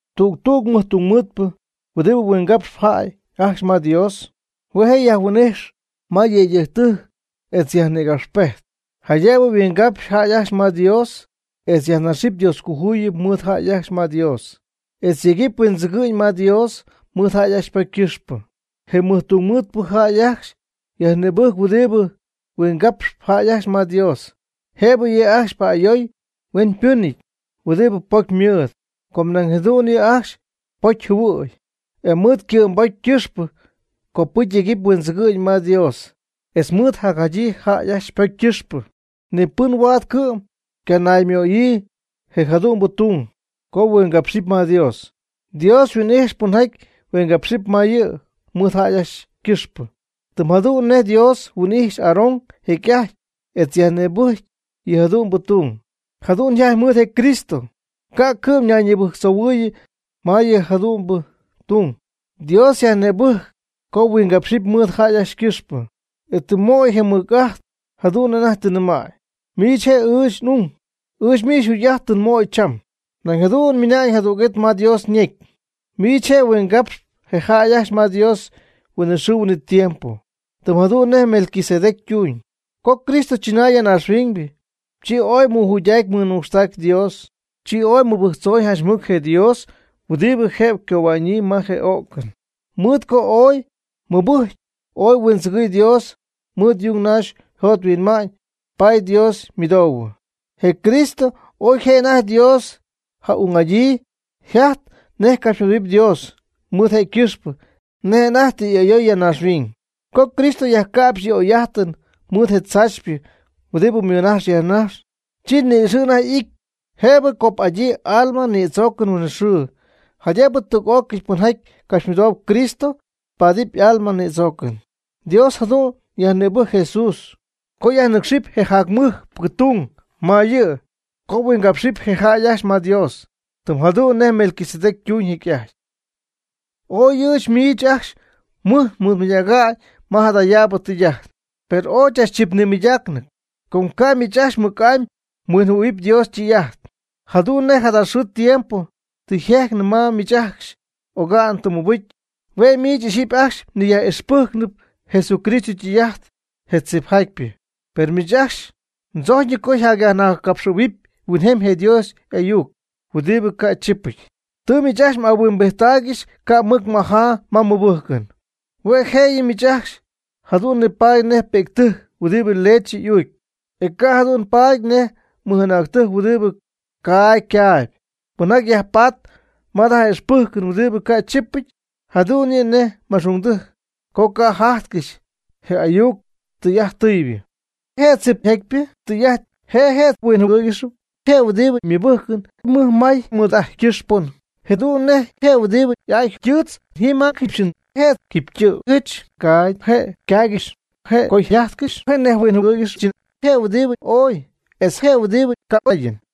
Tüg tüg mɨjtungmɨɨdpɨ huɨdibɨ huingapxp jäy ajcxy ma Dios, hue' je' yajhuin'ijxp ma yëydɨjctɨjc, etz yajnïgapxpejty, jaydëbɨ yhuingapx jäy ajcxy ma Dios etz yajnaxɨpy Dioscojuyip mɨɨd jäy ajcxy ma Dios, etz yegɨpy huindzɨgɨ'ñ ma Dios mɨɨd jäy ajcxy ypocy ycɨxpɨ. Je mɨjtungmɨɨdpɨ jäy ajcxy yajnïbɨjc huɨdibɨ huingapxp jäy ajcxy ma Dios, jëbɨ yɨ' ajcxy pa'ayooy huenpɨnɨty huɨdibɨ pocy ymɨɨd, com nañ jadu'n yɨ' ajcxy pocy jɨhuɨ̈y. E mɨɨd ycɨ'mbocy ycɨxpɨ copɨcy yegɨpy huindzɨgɨ'ñ ma Dios etz mɨɨd jacjadyii jäy ajcxy ypocy ycɨxpɨ. Ni pɨn huaad cɨ'm ycanaymöyii je jadu'mbɨ tung co yhuingapxɨty ma Dios. Dios yhuin'ijxpy pɨnjaty huingapxɨp ma yɨ' mɨɨd jäy ajcxy ycɨxpɨ, tɨm jadu'n nej Dios huin'ijxy Aaron jecy'ajty etz yajnïbɨjcy yɨ jadu'mbɨ tung. Jadu'n yjajty mɨɨd je Cristo, ca' cɨ'm nayñibɨjctzoohuɨɨyɨ ma yɨ jadu'mbɨ tung. Dios yajnïbɨjcɨ co huingapxɨp mɨɨd jäy ajcxy ycɨxpɨ, e tɨ ymöyii je mɨj'ajt jadu'n nej anajty tɨ nɨmäy: Miich je' ɨɨch n'ung. Ɨɨch miich mjugy'ajt tɨ mmöy cham. Nañ jadu'n ymɨna'ñ jadüg'it ma Dios ñecy: Miich je' mhuingapxyp je jäy ajcxy ma Dios huinɨxɨɨ huinɨtiempo, tɨm jadu'n nej Melquisedec ytuuñ. Co Cristo chɨnay ya naaxhuiñ, chi ooy mɨjuydägy mɨnucxtägy Dios, chi ooy mɨbɨjctzoy janch mɨc je Dios huɨdibɨ jëbɨ ycohua'ñyii ma je o'cɨn. Mɨɨd co ooy mɨbɨjcy ooy huindzɨgɨɨy Dios mɨɨd yung naxy yjot yhuinma'ñ, paady Dios ymɨdoohuɨ. Je Cristo oy je' anajty Dios ja'ung'adyii, yjajtɨ nej ycapxymɨdoohuɨpy Dios, mɨɨd je' ycɨxpɨ nej anajty tɨ y'ayoy ya naaxhuiñ. Co Cristo yajca'pxy yɨ' y'oy'ajtɨn mɨɨd je tzaachypɨ huɨdibɨ ymɨnajxy yajnajxy, chi ni'ixɨ' anajty y'ity jëbɨ cop'adyii alma nïdzoocɨn huinɨxɨɨ, jaydëbɨ tüg'ócɨy pɨnjaty capxymɨdoob Cristo, ypaadɨp ajcxy y'alma nïdzoocɨn. Dios jadu'n yajnïbɨjcy Jesús co yajnɨcxɨp je jac mɨjpɨ tung ma yɨ' co huingapxɨp jäy ajcxy ma Dios, tɨm jadu'n nej Melquisedec ytuñ jecy'ajty. Ooy ɨɨch miich ajcxy mɨj nmɨɨdmɨydäga'ñ ma jadayaabɨ tɨy'ajt, per ooy chachchip nimɨydaacnɨty, com ca' miich ajcxy mɨc'amy mhuinɨjɨhuɨ̈huɨpy Dios ytɨy'ajt. Jadu'n nej jada xɨɨ tiempo tɨ yjejcnɨ ma miich ajcxy oga'n tɨ mmɨbɨcy. Hue' miich ixyipy ajcxy mniyaj'ixpɨjcnɨp Jesucristo ytɨy'ajt je tzipjatypɨ. Per miich ajcxy mdzojcyñɨ co myajnajtzcapxɨ̈huɨpy huinjemy je Dios y'ayuc huɨdibɨ ca' chipɨty. Tɨ miich ajcxy m'ahuimbijttaaygɨxy ca' mɨc majaa ma mmɨbɨjcɨn. Hue' jëyɨ miich ajcxy jadu'n nipaady nej pi'ctɨjc huɨdibɨ leche uucp, e ca' jadu'n paady nej mɨj'anäctɨjc huɨdibɨ caagy caayb. Pɨnjaty yajpatp ma jada ixpɨjcɨn huɨdibɨ ca' chipɨty, jadu'n yɨ' nej ma'xungdɨjc com ca' jajtcɨxy je ayuc tɨy'ajt tɨybɨ. Je' tzipjatpyɨ tɨy'ajt je je' winjɨhuɨɨygɨxp, je' huɨdibɨ ymɨbɨjkɨn mɨj may mɨd'ajtkɨxpɨn, jɨdu'n nej je' huɨdibɨ y'aa ytɨɨtz jim ajkɨxyɨn je' tɨ̈tzpɨ jɨch kaagy je' ykaaygɨxpy, je' ko yjajtkɨxpy je' nej winjɨwɨɨygɨxɨchɨn je' huɨdibɨ oy, etz je' huɨdibɨ ka'oyɨn.